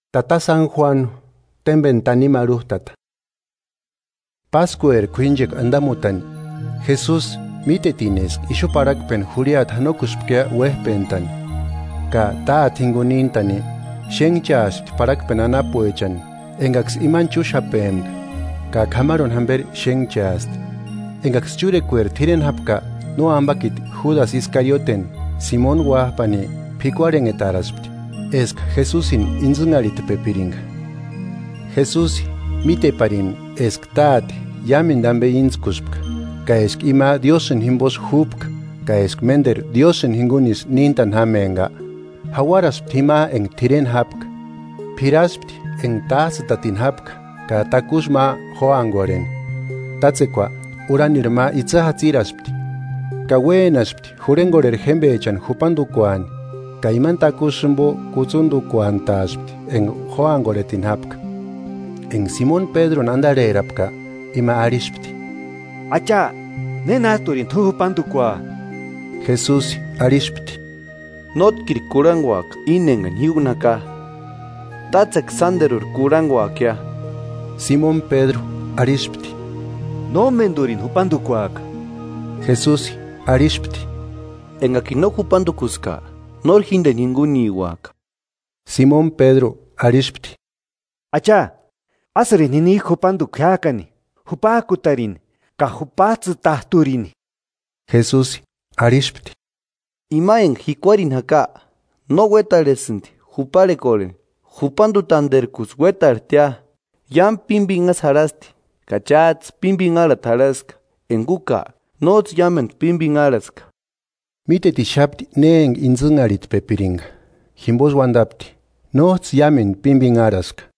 Jesusi jurhengorheri jémbechani jupandukuasti. Páskueri k'uínchekua andamutani, Jesusi mítetini eska ixu parhakpeni jurhiata janokuspkia uéjpentani ka Táte jinguni níntani, xénhchaaspti parhakpeni anapuechani engaksï imani chúxapempaka, ka k'amarhuni jamberi xénhchaasti. Engaksï chúrekueri t'ireni jápka, nóambakiti Júdasï Iskarioteni, Simoni uájpani, p'ikuarhenhetaraspti eska Jesusini intsïnharhitpepiringa, Jesusi míteparini eska Táte iámendu ambe íntskuspka ka eska ima Diósïni jimbosï júpka ka eska ménderu Diósïni jingunisï níntani jámempka, jauaraspti jima enga t'ireni jápka, p'iraspti enga tájtsïtatini jápka ka takusï ma jóangorheni. Tátsekua urhanirhu ma itsï jatsiraspti ka uénaspti jurhengorheri jémbechani jupandukuani ka imani takusï jimbo kutsundukuantaaspti enga jóangorhetini jápka. Enga Simoni Pédruni andarherapka; ima arhispti: “Acha, ¿Nénajturini t'u jupandukua?” Jesusi arhispti: “Nótkiri kurhanguaka íni engani ji úni jaka: Tátsekua sánderuri kurhanguakia.” Simoni Pédru arhispti: “Nómendurini jupandukuaka.” Jesusi arhispti: “Engakini no jupandukuska nóri jíndeni jinguniuaka.” Simoni Pédru arhispti: “Acha, ásïrini jinijku jupanduku jiájkani, jupajkutarini ka jupajtsïtajturini.” Jesusi arhispti: “Ima enga jikuarini jaka, no uétarhesïndi juparhekorheni, [jupanduntanderkusï uétarhejtia] iámu pímbinhasï jarhasti. Ka chájtsï pímbinharhati jarhaska, enga úka nójtsï iámendu pímbinharhaska.” Mítetixapti ne enga intsïnharhitpepiringa, jimbosï uandapti: “Nójtsï iámendu pímbinharhaska.”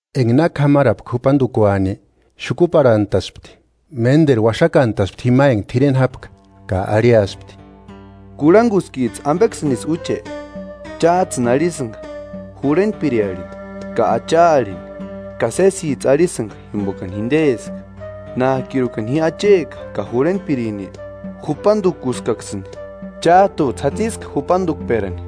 Enga na k'amarapka jupandukuani, xukuparhantaspti, ménderu uaxakantaspti jima enga t'ireni jápka, ka arhiaspti: “¿Kurhanguskijtsï ambeksïnisï úche?” “Chájtsïni arhisïnga ‘Jurhentpiri’ arhini, ka ‘Acha’ arhini, ka sésijtsï arhisïnga jimbokani jindeska. Nájkirukani ji Acheka ka Jurhentpirini jupandukuskaksïni, chájtujtsï jatsiska jupandukperani.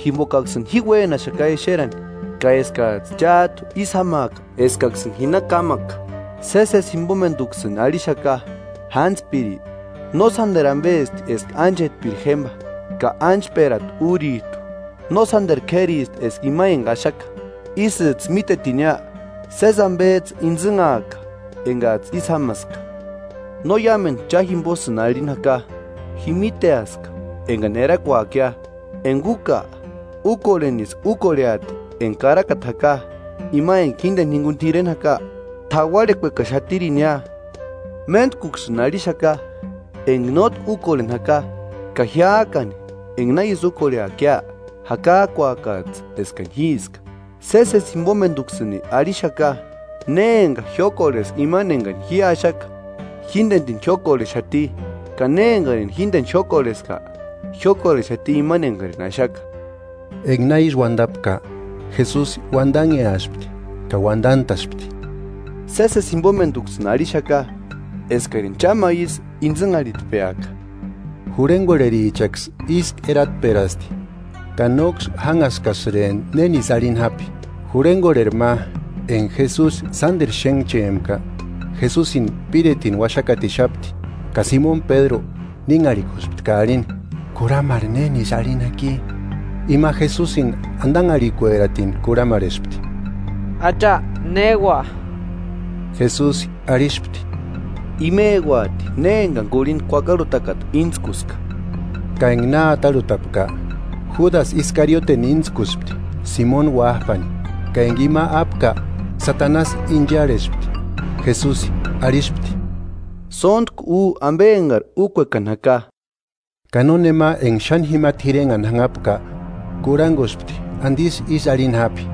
Jimbokaksïni ji uénaxaka exerani, ka eskajtsï chájtu ísï jámaaka eskaksïni ji na kámaka. Sésesi jimbomenduksïni arhixaka: Jántspiri no sánderu ambesti eska ánchetpiri jémba, ka ánchperata úrijtu no sánderu k'éristi eska ima enga axaka. Isïjtsï mítetinia, sési ambejtsï íntsïnhaaka engajtsï ísï jámaska.” No iámendu cha jimbosïni arhini jaka; ji míteaska engani erakuakia; enga úka úkorhenisï úkorheati enga Karakata jaka: Ima enga jíndeni jinguni t'ireni jaka t'auarhekuekaxatirinia. “Méntkuksïni arhixaka, enga nótki úkorheni jaka, ka jiájkani enga na ísï úkorheakia jakajkuakajtsï eskani Jíska. Sésesi jimbomenduksïni arhixaka: Ne enga jiókorheska imani engani ji axaka jíndenirini jiókorhexati, ka ne engarini jíndeni jiókorheska, jiókorhexati Imani engarini axaka.” Enga na ísï uandapka, Jesusi uandanheaspti ka uandantaspti: “Sésesi jimbomenduksïni arhixaka eskarini cha ma isï intsïnharhitpeaka.” Jurhengorherichaksï ísku eratperaspti, ka nóksï jánhaskasïrempti nénisï arhini jápi. Jurhengorheri ma, enga Jesusi sánderu xénhchempka, Jesusini píretini uaxakatixapti. Ka Simoni Pédru nínharhikuspti ka arhini: “Kurhamarhe nénisï arhini jaki.” Ima Jesusini andanharhikueratini kurhamarhespti: Acha, ¿Néua? Jesusi arhispti: “Imeuati ne engani kurhinda kuakarhutakata íntskuska.” Ka enga na atarhutapka, Júdasï Iskariote íntskuspti Simoni uájpani. Ka enga ima ápka Satanasi incharhespti. Jesusi arhispti: “Sóntku u ambe engari úkuekani jaka.” Ka nónema enga xáni jima t'irenhani jánhapka kurhanguspti andisï ísï arhini jápi.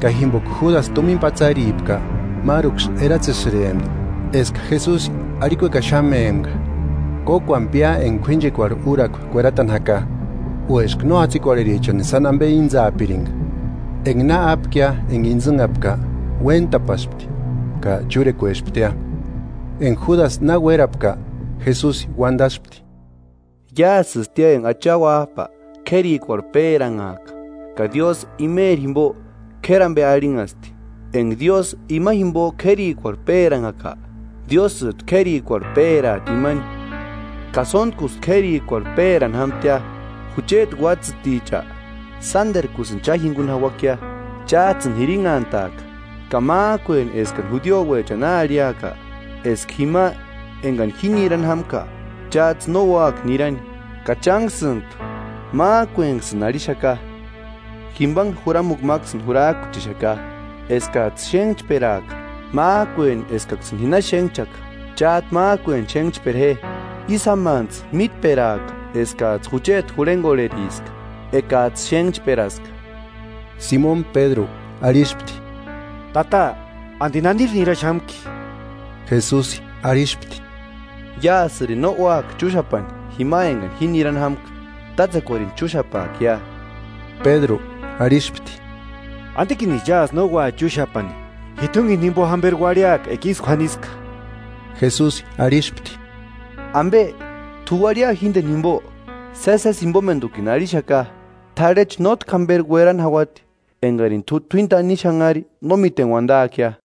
Ka jimboka Júdasï tumina patsaripka, máruksï eratsesïrempti eska Jesusi arhikuekaxamempka: “Kókuani pia enga k'uínchekuarhu úrakua kueratani jaka”, o eska no jatsikorherichani sáni ambe íntsaapiringa. Enga na ápkia enga intsïnhapka, uéntapaspti. Ka chúrekuesptia. Enga Júdasi na uérapka, Jesusi uandaspti: –Iásïstia enga Acha Uájpa k'érikuarhu péranhaka ka Diósï Imeri jimbo k'éri ambe arhinhasti. Enga Diósï Ima jimbo k'érikuarhu péranhaka, Diósïjtu k'érikuarhu péraati imani, ka sóntkusï k'érikuarhu pérani jámtia “Jucheti uátsïticha, sánderkusïni cha jinguni jauakia. Chájtsïni jirinhantaaka, ka májkueni eskani judiouechani na arhiaka, eska jima engani ji nirani jámka, chájtsï no úaka nirani, ka chánksïntu májkuenksïni arhixaka. Jimbanhe juramukua máksïni jurajkuchexaka: Eskajtsï xénhchperaaka. Májkueni eskaksïni ji na xénhchkaka, chájtu májkueni xénhchpera je. Ísï jámantsï mítperaaka eskajtsï jucheti jurhengorheriska ekajtsï xénhchperaska.” Simoni Pédru arhispti: –Tata, ¿Andi naniri niraxamki? Jesusi arhispti: –Iásïrini no úaka chúxapani jima engani ji nirani jámka; tátsekuarini chúxapaakia. Pédru arhispti: –¿Andikinisï iásï no ua chúxapani? ¡Ji t'úngeni jimbo jamberi uarhiaka enga ísï k'uaniska! Jesusi arhispti: –¿Ambe, t'u uarhia jíndeni jimbo? Sésesi jimbomendukini arhixaka: T'arhechu nótki jamberi uerani jauati, engarini t'u t'uíni tanimu xanharhi no míteni uandaakia.